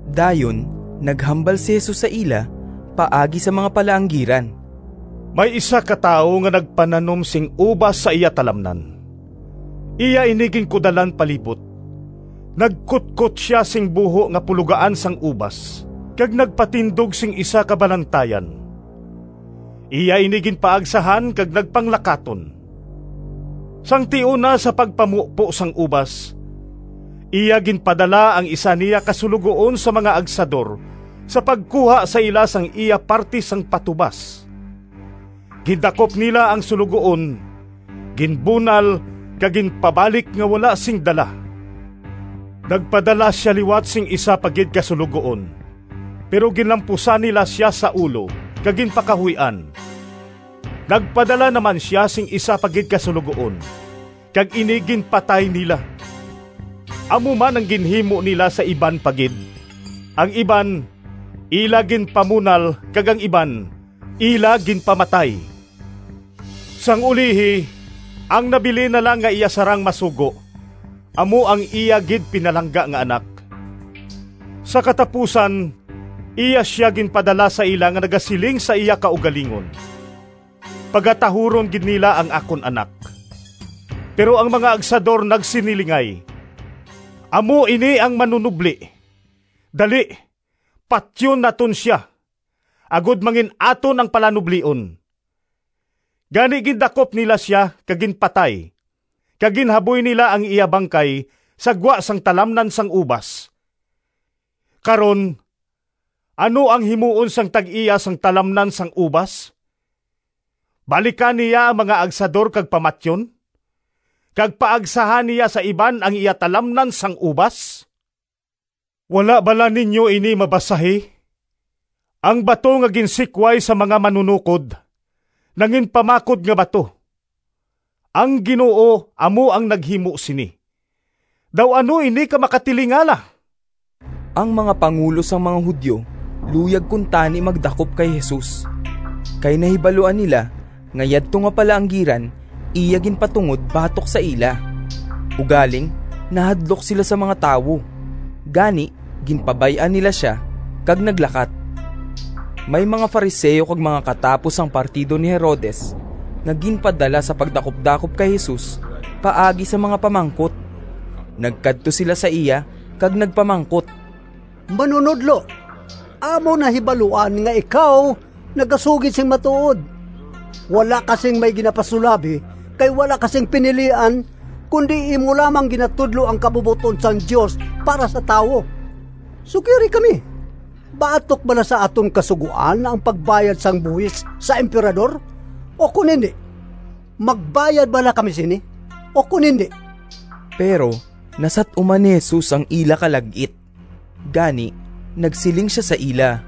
Dayon naghambal si Jesus sa ila paagi sa mga palaanggiran. “May isa ka tawo nga nagpananom sing ubas sa iya talamnan, iya ini ginkudalan palibot, nagkutkot sia sing buho nga pulogaan sang ubas kag nagpatindog sing isa ka balantayan. Iya ini ginpaagsahan kag nagpanglakaton. Sang tion na sa pagpamupo sang ubas, iya ginpadala ang isa niya ka suloguon sa mga agsador sa pagkuha sa ila sang iya parti sang patubas. Gindakop nila ang suloguon, ginbunal kag ginpabalik nga wala sing dala. Nagpadala sia liwat sing isa pa gid ka suloguon, pero ginlampusan nila sia sa ulo kag ginpakahuy-an. Nagpadala na man sia sing isa pa gid ka suloguon, kag ini ginpatay nila. Amo man ang ginhimo nila sa iban pa gid, ang iban ila ginpamunal kag ang iban ila ginpamatay. Sang ulihi ang nabilin na lang nga iya sarang masugo amo ang iya gid pinalangga nga anak. Sa katapusan iya sia ginpadala sa ila nga nagasiling sa iya kaugalingon, ‘Pagatahuron gid nila ang akon anak.’ Pero ang mga agsador nagsinilingay, ‘Amo ini ang manunobli! Dali, patyon naton sia, agod mangin-aton ang palanublion!’ Gani gindakop nila sia, kag ginpatay, kag ginhaboy nila ang iya bangkay sa gwa sang talamnan sang ubas. “Karon, ano ang himuon sang tag-iya sang talamnan sang ubas? Balikan niya ang mga agsador kag pamatyon, kag paagsahan niya sa iban ang iya talamnan sang ubas. Wala bala ninyo ini mabasahi? ‘Ang bato Nga ginsikway sang mga manunokod, Nanginpamakod nga bato. Ang Ginoo amo ang naghimo sini, Daw ano ini ka makatilingala!’” Ang mga pangulo sang mga Judio luyag kuntani magdakop kay Jesus, kay nahibaluan nila nga yadto nga palaanggiran iya ginpatungod batok sa ila. Ugaling nahadlok sila sa mga tawo, gani ginpabay-an nila sia kag naglakat. May mga Fariseo kag mga katapo sang partido ni Herodes nga ginpadala sa pagdakupdakop kay Jesus paagi sa mga pamangkot. Nagkadto sila sa iya kag nagpamangkot, “Manunodlo, amon nahibaluan nga ikaw nagasugid sing matuod. Wala ka sing may ginapasulabi kay wala ka sing pinilian, kundi imo lamang ginatudlo ang kabubot-on sang Dios para sa tawo. Sugiri kami, batok bala sa aton Kasugoan ang pagbayad sang buhis sa Emperador ukon indi? Magbayad bala kami sini ukon indi?” Pero nasat-uman ni Jesus ang ila kalag-it, gani nagsiling sia sa ila,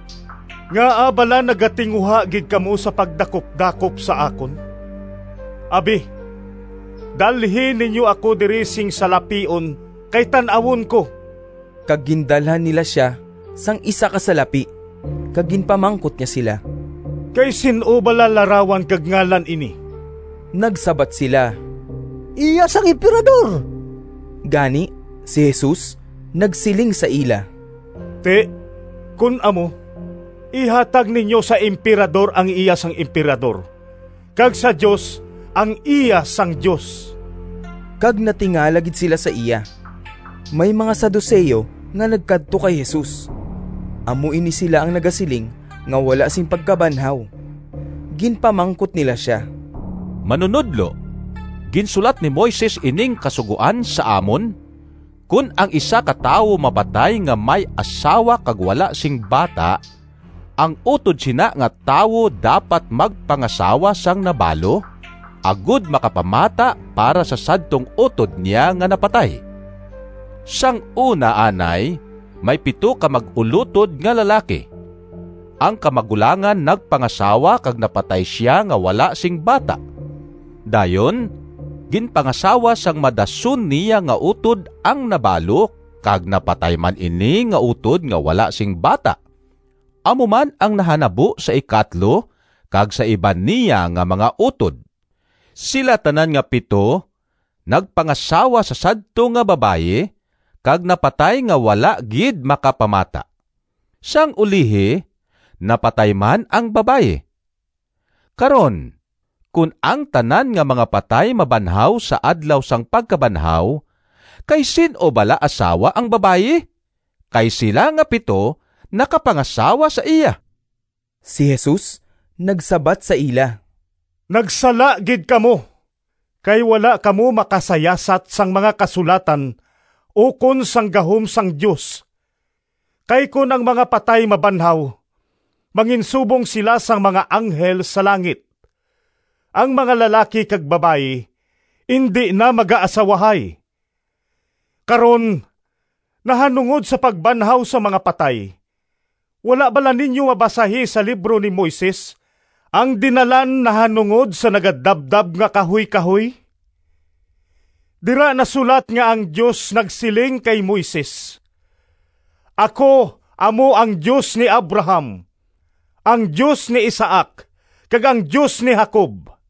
“Ngaa bala nagatinguha gid kamo sa pagdakupdakop sa akon? Abi, dalhi ninyo ako diri sing salapion kay tan-awon ko.” Kag gindalhan nila sia sing isa ka salapi kag ginpamangkot niya sila, “Kay sin-o bala larawan kag ngalan ini?” Nagsabat sila, “Iya sang Emperador.” Gani si Jesus nagsiling sa ila, “Ti, kon amo, ihatag ninyo sa Emperador ang iya sang Emperador kag sa Dios ang iya sang Dios.” Kag natingala gid sila sa iya. May mga Saduceo nga nagkadto kay Jesus. (Amo ini sila ang nagasiling nga wala sing pagkabanhaw.) Ginpamangkot nila sia, “Manunodlo, ginsulat ni Moises ining kasugoan sa amon, ‘Kon ang isa ka tawo mapatay nga may asawa kag wala sing bata, ang utod sina nga tawo dapat magpangasawa sang nabalo, agod makapamata para sa sadtong utod niya nga napatay.’ Sang una anay may pito ka mag-ulotod nga lalaki. Ang kamagulangan nagpangasawa kag napatay sia nga wala sing bata. Dayon ginpangasawa sang madason niya nga utod ang nabalo kag napatay man ini nga utod nga wala sing bata. Amo man ang nahanabo sa ikatlo kag sa iban niya nga mga utod. Sila tanan nga pito nagpangasawa sa sadto nga babayi kag napatay nga wala gid makapamata. Sang ulihi, napatay man ang babayi. Karon, kon ang tanan nga mga patay mabanhaw sa adlaw sang pagkabanhaw, kay sin-o bala asawa ang babayi, kay sila nga pito nakapangasawa sa iya?” Si Jesus nagsabat sa ila, “Nagsala gid kamo, kay wala kamo makasayasat sang mga Kasulatan ukon sang gahom sang Dios! Kay kon ang mga patay mabanhaw, manginsubong sila sang mga anghel sa langit, ang mga lalaki kag babayi indi na magaasawahay. Karon nahanungod sa pagbanhaw sang mga patay, wala bala ninyo mabasahi sa libro ni Moises ang dinalan nahanungod sa nagadabdab nga kahuykahoy? Dira nasulat nga ang Dios nagsiling kay Moises, ‘Ako amo ang Dios ni Abraham, ang Dios ni Isaac kag ang Dios ni Jacob.’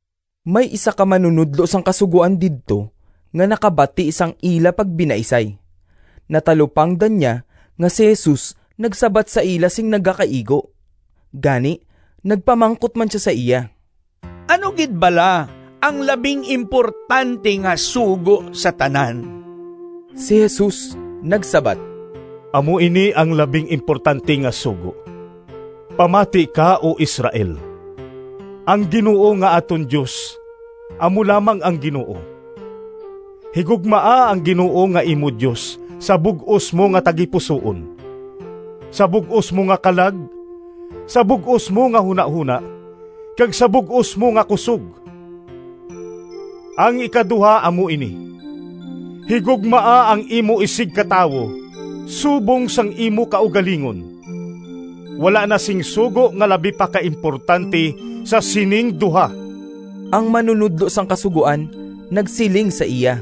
May isa ka manunodlo sang Kasugoan didto nga nakabati sang ila pagbinaisay. Natalupangdan niya nga si Jesus nagsabat sa ila sing nagakaigo. Gani, nagpamangkot man sia sa iya, “Ano gid bala ang labing importante nga sugo sa tanan?” Si Jesus nagsabat, “Amo ini ang labing importante nga sugo, ‘Pamati ka, O Israel, ang Ginoo nga aton Dios amo lamang ang Ginoo. Higugmaa ang Ginoo nga imo Dios sa bug-os mo nga tagipusoon, sa bug-os mo nga kalag, sa bug-os mo nga hunahona, kag sa bug-os mo nga kusog.’ Ang ikaduha amo ini, ‘Higugmaa ang imo isigkatawo subong sang imo kaugalingon.’ Wala na sing sugo nga labi pa ka importante sa sining duha.” Ang manunodlo sang Kasugoan nagsiling sa iya,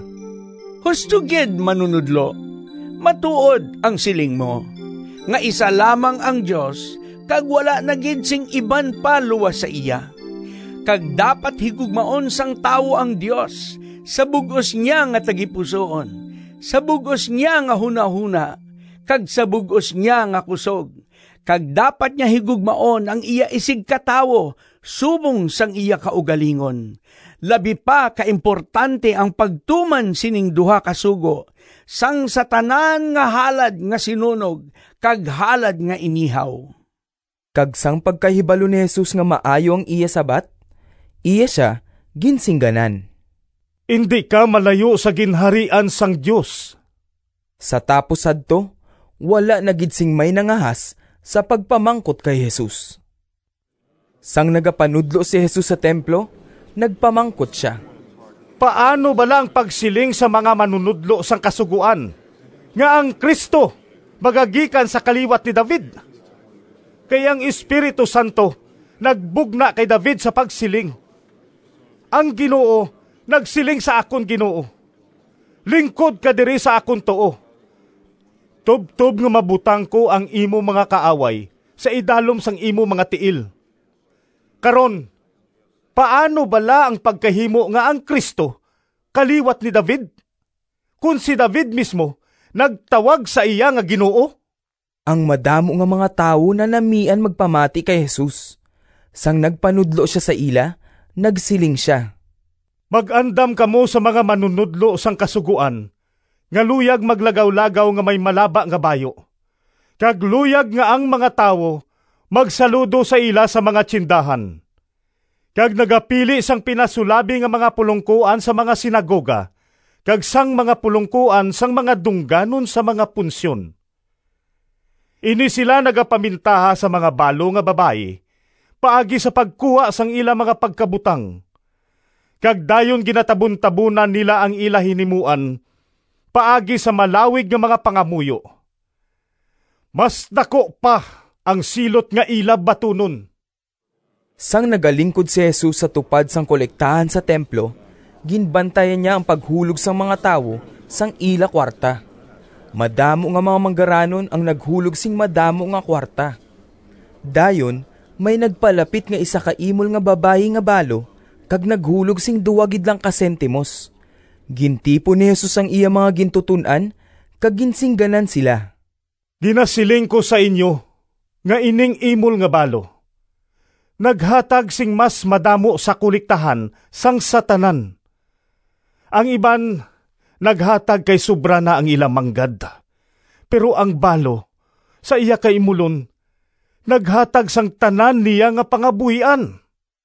“Husto gid, Manunodlo! Matuod ang siling mo, nga isa lamang ang Dios, kag wala na gid sing iban pa luas sa iya. Kag dapat higugmaon sang tawo ang Dios sa bug-os niya nga tagipusoon, sa bug-os niya nga hunahona, kag sa bug-os niya nga kusog, kag dapat niya higugmaon ang iya isigkatawo subong sang iya kaugalingon. Labi pa ka importante ang pagtuman sining duha ka sugo sang sa tanan nga halad nga sinunog kag halad nga inihaw.” Kag sang pagkahibalo ni Jesus nga maayo ang iya sabat, iya sia ginsingganan, “Indi ka malayo sa Ginharian sang Dios.” Sa tapos sadto, wala na gid sing may nangahas sa pagpamangkot kay Jesus. Sang nagapanudlo si Jesus sa templo, nagpamangkot sia, “Paano bala ang pagsiling sang mga manunodlo sang Kasugoan nga ang Cristo magagikan sa kaliwat ni David? Kay ang Espiritu Santo nagbugna kay David sa pagsiling: ‘Ang Ginoo nagsiling sa akon Ginoo, Lingkod ka diri sa akon tuo, Tubtob nga mabutang ko Ang imo mga kaaway Sa idalom sang imo mga tiil.’ Karon, paano bala ang pagkahimo nga ang Cristo kaliwat ni David, kon si David mismo nagtawag sa iya nga ‘Ginoo’?” Ang madamo nga mga tawo nanamian magpamati kay Jesus. Sang nagpanudlo sia sa ila, nagsiling sia, “Mag-andam kamo sa mga manunodlo sang Kasugoan nga luyag maglagawlagaw nga may malaba nga bayu, kag luyag nga ang mga tawo magsaludo sa ila sa mga tiyendahan, kag nagapili sang pinasulabi nga mga pulongkoan sa mga sinagoga kag sang mga pulongkoan sang mga dungganon sa mga punsyon. Ini sila nagapamintaha sa mga balo nga babayi paagi sa pagkuha sang ila mga pagkabutang, kag dayon ginatabuntabonan nila ang ila hinimuan paagi sa malawig nga mga pangamuyo. Mas daku pa ang silot nga ila batunon.” Sang nagalingkod si Jesus sa tupad sang kolektahan sa templo, ginbantayan niya ang paghulog sang mga tawo sang ila kuwarta. Madamo nga mga manggaranon ang naghulog sing madamo nga kuwarta. Dayon may nagpalapit nga isa ka imol nga babayi nga balo kag naghulog sing duha gid lang ka sentimos. Gintipon ni Jesus ang iya mga gintuton-an kag ginsingganan sila, “Ginasiling ko sa inyo nga ining imol nga balo naghatag sing mas madamo sa kolektahan sang sa tanan. Ang iban naghatag kay sobra na ang ila manggad, pero ang balo, sa iya kaimulon, naghatag sang tanan niya nga pangabuhian.”